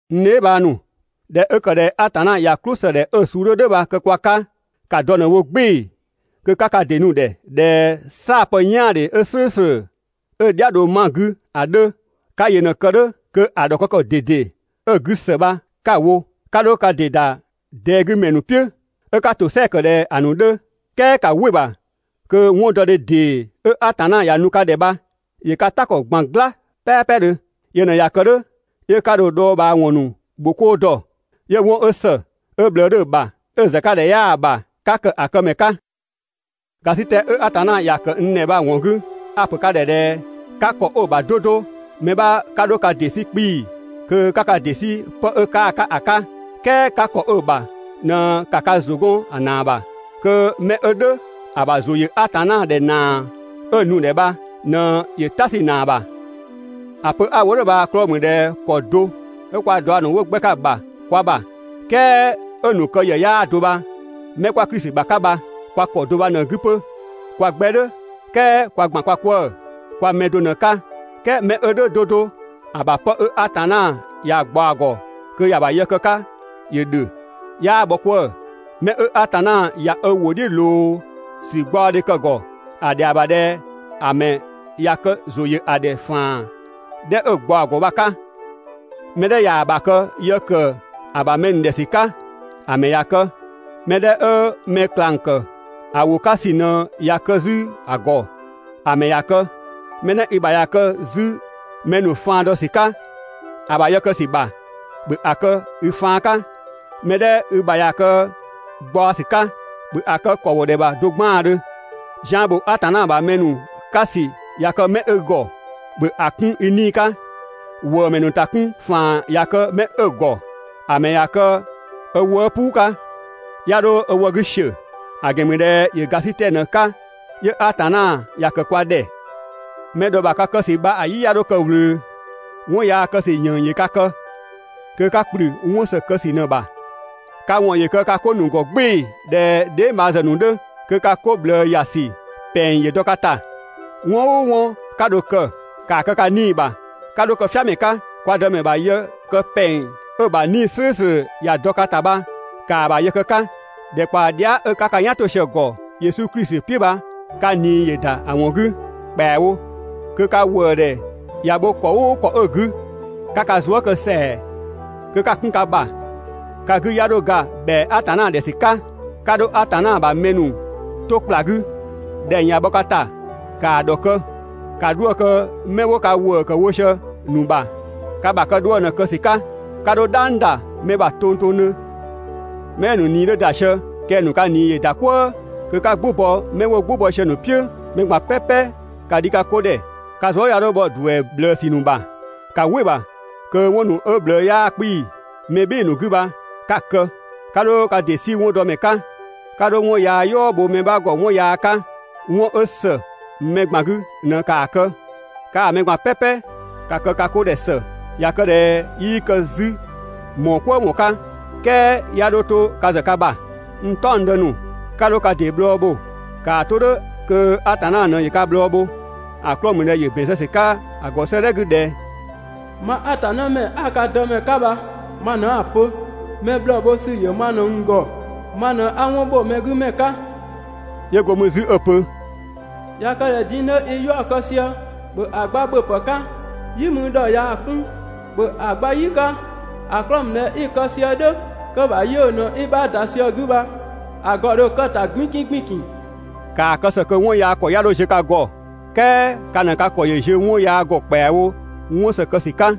N dheebhang ‑nu, ꞊dhɛ 'ö ‑kë ꞊dhɛ Atanna ꞊ya "klʋsëdhɛ 'ö‑ suu 'dhö "dhʋ̈ bha‑ kë kwa 'ka, ‑ka dɔ ꞊në‑ wo "gbɩɩ‑ kö 'ka ka ‑dɩ nu‑ ‑dhɛ ꞊dhɛ "saa‑ pë "yaandhe 'ö "slʋ̈ʋ̈slʋ̈, 'ö‑ "dhia‑ dho 'ma‑ 'gü ‑a 'dhö, 'ka yö ꞊në‑ kë "dhʋ̈, kö‑ ‑dhɔkë ‑kɔ ꞊dede 'ö‑ 'gü ‑së bha 'ka‑ wo. 'Ka 'dho ka ‑dɩ ‑da ꞊dɛɛ 'gü ‑mɛ ‑nu "piʋ̈, 'ö 'ka ‑tosɛa ‑kë ꞊dhɛ‑ ‑nu 'dhö, "kɛɛ ‑ka "wɩ‑ ‑bha kö 'wɔndɔdhe ‑dee 'ö Atanna ‑ya nu ka ‑dhɛ bha, ‑yö ka "ta ‑kɔ ꞊gban "gla "pɛɛpɛdhö. Yö ꞊në ꞊ya kë "dhʋ̈ 'yö 'ka dho‑ dhɔɔbhaawɔn ‑nu ‑bho 'koo dɔ. 'Yö 'wɔn 'ö ‑së, 'ö ꞊bhlëë 'dhö‑ ‑bha, 'ö‑ ‑zë 'ka ‑dhɛ 'yaa‑ ‑bha, 'ka ‑kë ‑a këmɛ 'ka. ‑Gasitɛ 'ö Atanna ‑ya ‑kë n ‑dhɛ bha‑ ‑wɔn 'gü, a‑ ‑pö ka ‑dhɛ ꞊dhɛ 'ka ‑kɔ 'ö‑ ‑bha 'do 'do, mɛ 'bha 'ka 'dho ka ‑dɩ 'sü 'kpii‑ kö 'ka ka ‑dɩ 'sü 'pë 'ö 'kaa‑ 'ka ‑a 'ka, "kɛɛ 'ka ‑kɔ 'ö ‑bha ꞊në ‑ka ka ‑zʋ 'gɔn‑ ‑naa ‑bha, kö 'mɛ 'ö "dhʋ̈ ‑a ‑bha ‑zʋ ‑yö Atanna ‑dhɛ ‑naa 'ö‑ nu‑ ‑dhɛ bha ꞊në ‑yö "ta 'sü‑ ‑naa ‑bha. ‑A pö 'a‑ wo "dhʋ̈ bha‑ 'klɔɔ‑ ‑mü ꞊dhɛ ‑kɔ do 'ö kwa daɔ ‑nu 'wo 'gbɛ 'ka‑ ‑bha kwa ‑bha, "kɛɛ 'ö‑ ‑nu kë ‑yë 'yaa do bha, Mɛ 'kwa Klisi ‑bha 'ka bha kwa ‑kɔ do bha ꞊në‑ 'gü 'pö. Kwa 'gbɛ "dhʋ̈, "kɛɛ kwa ‑gban kwa 'kwëë‑, kwa mɛ do ꞊në‑ 'ka. "Kɛɛ mɛ 'ö "dhʋ̈ 'do 'do ‑a ‑bha 'pë 'ö Atanna ‑ya ꞊gbaɔ‑ ‑gɔ kö ‑ya ‑bha yë kë‑ 'ka ‑yö ‑dhö, 'yaa bhɔ 'kwëë‑. Mɛ 'ö Atanna ꞊ya ö ‑wʋ "dhiʋ̈ ꞊loo ‑sü gbaɔdhe kë‑ ‑gɔ, ‑a ‑dhɛa ‑bha ꞊dhɛ ‑a ‑mɛ ‑ya kë ‑zʋ ‑yö ‑a ‑dhɛ ‑faan 'dhɛ 'ö‑ ꞊gbaɔ‑ ‑gɔ bha‑ 'ka. Mɛ 'dhɛ ꞊yaa‑ ‑bha kë yë ‑kë ö ‑bha mɛ ‑nu ‑dhɛ ‑sü 'ka, ‑a ‑mɛ ‑ya kë. Mɛ 'dhɛ 'ö mɛ ꞊klang ‑kë ‑a ‑wʋ 'ka ‑sü ꞊në ꞊ya kë 'zü‑ ‑gɔ, ‑a ‑mɛ ‑ya kë. Mɛ 'dhɛ i ‑bha ‑ya kë 'zü mɛ ‑nu faan dɔ ‑sü 'ka ‑a ‑bha yë kë ‑sü ‑bha, ‑bhö ‑a kë i faan 'ka. Mɛ 'dhɛ i ‑bha ꞊ya kë gbaɔsü 'ka, ‑bhö ‑a kë ‑kɔwodhɛ ‑bha do 'gbaandhö. Zian ‑bho Atanna ‑bha mɛ ‑nu 'ka ‑sü ꞊ya kë 'mɛ i ‑gɔ, ‑bhö ‑a 'kun i 'nii‑ 'ka. ‑Wëëmɛ ‑nu ‑ta 'kun ‑faan ꞊ya kë 'mɛ 'ö‑ ‑gɔ, ‑a mɛ ‑ya kë ö wëë' "puu 'ka, 'ya 'dho ö wë 'gü ‑siö, ‑a ‑gɛn ‑mü ꞊dhɛ ‑yö ‑gasitɛ ꞊në‑ 'ka 'yö Atanna ‑ya ‑kë kwa ‑dhɛ. Mɛ ‑dhɔ ‑bha ka kë ‑sü "yi 'ya 'dho kë‑ ꞊wlöö. 'Wɔn yaa kë ‑sü ‑yënng ‑yö ka kë kö 'ka ‑kplü 'wɔn ‑së kë ‑sü ꞊në‑ ‑bha. Ka ‑wɔn ‑yö kë ka 'ko ‑nu ‑gɔ "gbɩɩ‑ ꞊dhɛ dheebhang ‑zë ‑nu 'dhö, kö ka 'ko ꞊bhlëë ‑ya ‑sü ‑pɛng ‑yö dɔ ka ‑ta. 'Wɔn "ʋʋ 'wɔn 'ka dho‑ kë, ‑kaa kë ka 'nii‑ ‑bha. 'Ka 'dho kë "fiamɛ 'ka, kwa Dëmɛ ‑bha yë kë ‑pɛng 'ö‑ ‑bha 'Nii‑ "slʋ̈ʋ̈slʋ̈ ‑ya dɔ ka ‑ta bha, ‑kaa ‑bha yë kë‑ 'ka! ‑Dhɛkpaɔ dhia" 'ö 'ka ka "yan 'to sië‑ ‑gɔ Yesu Klisi "piʋ̈ bha ka ꞊nii ‑yö ‑da ‑a ‑wɔn 'gü ‑kpɛawo. 'Kö ka ‑wëëdhɛ ꞊ya bho ‑kɔ "ʋʋ ‑kɔ 'ö‑ 'gü, 'ka ka zuë" kë ‑sɛa kö 'ka‑ 'kun ka ‑bha. Ka 'gü 'ya 'dho ga ‑bhɛa Atanna ‑dhɛ ‑sü 'ka. 'Ka 'dho Atanna ‑bha mɛ ‑nu 'to ‑kpla 'gü, ‑dhɛng ꞊ya bhɔ ka ‑ta, ‑kaa ‑dhɔkë. ‑Ka 'dhuë‑ kë 'mɛ 'wo ka ‑wëë ‑kë wo sië‑ ‑nu ‑bha, ka ‑bha kë 'dhuë‑ ꞊në‑ kë ‑sü 'ka, 'ka 'dho "dhang ‑da mɛ ‑bha tongtongdhö. Mɛ 'ö‑ ‑nu ꞊nii 'dhö ‑da sië kɛng‑ ‑nu ka ꞊nii ‑yö ‑da "kwëë, kö 'ka "gbʋ bɔ mɛ 'wo "gbʋ bɔ sië‑ ‑nu "piʋ̈. Mɛ ꞊gban "pɛpɛ ‑ka dhi ka 'ko ‑dhɛ, ka zuë" 'ya 'dho bhɔ ‑duɛ ꞊bhlëësü ‑nu ‑bha. ‑Ka "wɩ‑ ‑bha kö 'wɔn ‑nu 'ö‑ ꞊bhlëë 'yaa 'kpii‑ mɛ "bhɩɩ‑ ‑nu 'gü bha 'ka‑ kë. 'Ka 'dho ka ‑dɩ 'sü 'wɔndɔmɛ 'ka. 'Ka 'dho 'wɔn yaa "yɔɔ bho mɛ 'bha ‑gɔ 'wɔn yaa 'ka. 'Wɔn 'ö ‑së mɛ ꞊gban 'gü ꞊në ‑kaa kë. Kaa‑ mɛ ꞊gban "pɛpɛ ‑ka kë ka 'ko ‑dhɛ ‑së. ꞊Ya kë ꞊dhɛ 'yii kë 'zü ‑mɔɔ "kwëë ‑wɔn 'ka, "kɛɛ 'ya 'dho 'to ka ‑zë ka ‑bha. N "taɔngdë ‑nu, 'ka 'dho ka ‑dɩ bhlɔɔ bho, ‑kaa 'to "dhʋ̈ kö Atanna ꞊në ‑yö ka bhlɔɔ bho. ‑A 'klɔɔ‑ ‑mü ꞊dhɛ ‑yö ‑bɛn zë ‑sü 'ka‑ ‑gɔ 'sëëdhɛ 'gü ꞊dhɛ: «Mang Atanna ‑mɛ 'a ka Dëmɛ 'ka bha ma ꞊në 'a‑ pö: Mɛ bhlɔɔ bho ‑sü ‑yö ma ꞊në n ‑gɔ, ma ꞊në 'a 'wɔn ‑bho mɛ 'gü ‑mɛ 'ka. 'Yö go mü 'zü 'ö‑ pö: «꞊Ya kë ꞊dhɛ din‑ 'dhö i 'yaɔ‑ kë sië, ‑bhö ‑a gba ‑bhöpë 'ka. "Yi mü ‑dhɔ ꞊yaa‑ 'kun, ‑bhö ‑a gba "yi 'ka, ‑a 'klɔɔ‑ ‑mü ꞊dhɛ 'i‑ kë sië "dhʋ̈ kö‑ ‑bha 'yiʋ̈‑ ꞊në 'i‑ 'bha ‑da sië‑ 'gü bha, ‑a ‑gɔ ‑dho kë‑ ‑ta 'gbinkin ‑gbinkin.» ‑Kaa kë ‑së kö 'wɔn yaa ‑kɔ 'ya 'dho ziö ka ‑gɔ, "kɛɛ ka ꞊në ka ‑kɔ ‑yö ziö 'wɔn yaa ‑gɔ ‑kpɛawo 'wɔn ‑së kë ‑sü 'ka.